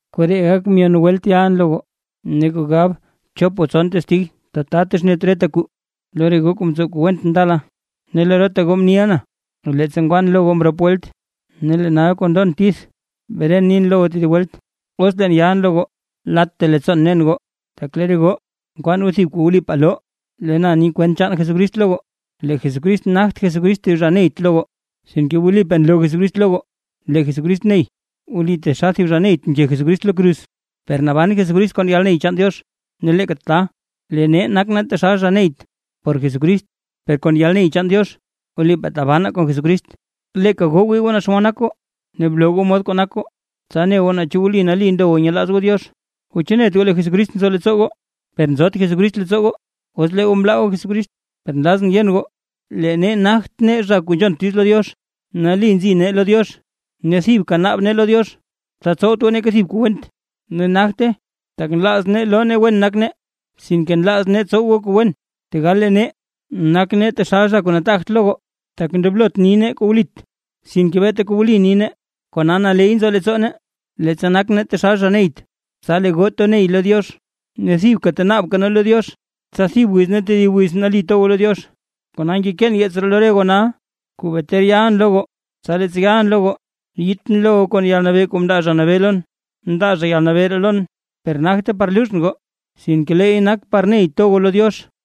Koree gak myon welt yalʼn lo goo. Ne kuu gab chop o tson testig tata texnet reta kuu. Lo re goo kuu mtsow kuu went ndala, ne lo reta goo mniʼa na leettsa ngwan lo goo mrop welt, ne lee nal kuu ndon tith bren nin lo goo tedib welt, os leen yalʼn lo goo, latta leettsoon nen goo. Tak lee re goo nkwaan goo thib kuu wlipaa loo lee na ni kwent Jesucrist lo goo. Lee Jesucrist nagt Jesucrist thib zha neyt lo goo, sinke wlipaa nloo Jesucrist lo goo lee Jesucrist ney. Wli taxal thib zha neyt mke Jesucrist lo kruz, per naban Jesucrist kon yalney chaan Diox. Ne leeka tata, lee nee nak nee taxal zha neyt por Jesucrist, per kon yalney chaan Diox wlipaa tabanaa kon Jesucrist. Leeka goo wii goo naa xomod nak goo ne bloo goo mod kuu nak goo, tsa ne goo naa chu wli nali ndo goo nyelaaz goo Diox. O ¿chu net goo lee Jesucrist nzo leettsoo goo? ¡Per nzot Jesucrist leettsoo goo, os lee goo mlaa goo Jesucrist! Per nlazʼn yen goo, lee nee nagt nee zha kuu nzhont diiz lo Diox nali nzi nee lo Diox. Ne thibka naab nee lo Diox, tsa tsowt goo neeka thib kuu went, ne nagte tak nlaaz nee loo nee wen nak nee, sinke nlaaz nee tsow goo kuu wen, tegal lee nee, nak nee taxal zha kuu nataagt lo goo. Tak ndoblot ni nee kuu wlit, sinke beeta kuu wli ni nee. Kona naley nzo leettsoo nee, leettsa nak nee taxal zha neyt, tsa lee goo to ney goo lo Diox, ne thibka tenaabka nee lo Diox tsa thib wiz ne tedib wiz nali to goo lo Diox. Kona ngekeen yeets ree lo goo nal kuu bee ter yalʼn lo goo, tsa leettsa yalʼn lo goo, yiitʼn lo goo kon yalnabee kuu mndaa Zha Nabee lon, mndaa zha yalnabee ree lon, per nagte par luuzhʼn goo, sinke leey nak par ney to goo lo Diox.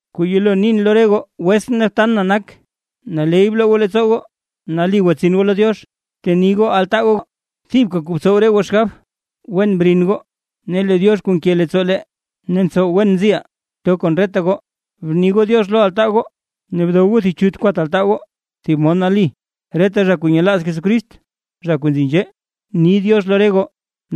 Kuu yelo nin lo re goo wetsʼn ne btan na nak, naley bloo goo leettsoo goo, nali gwatsin goo lo Diox, bteni goo altaa goo, thibka kuu btsow re goo xgab, wen brin goo ne lee Diox kuu nke leettsoo lee, ne ntsow wen nziʼaa, to kon reta goo. Bni goo “diox” lo altaa goo, ne dow goo thib chut kwat altaa goo, thib mod nali. Reta zha kuu nyelaaz Jesucrist, zha kuu nzi nzhee, ni “diox” lo re goo.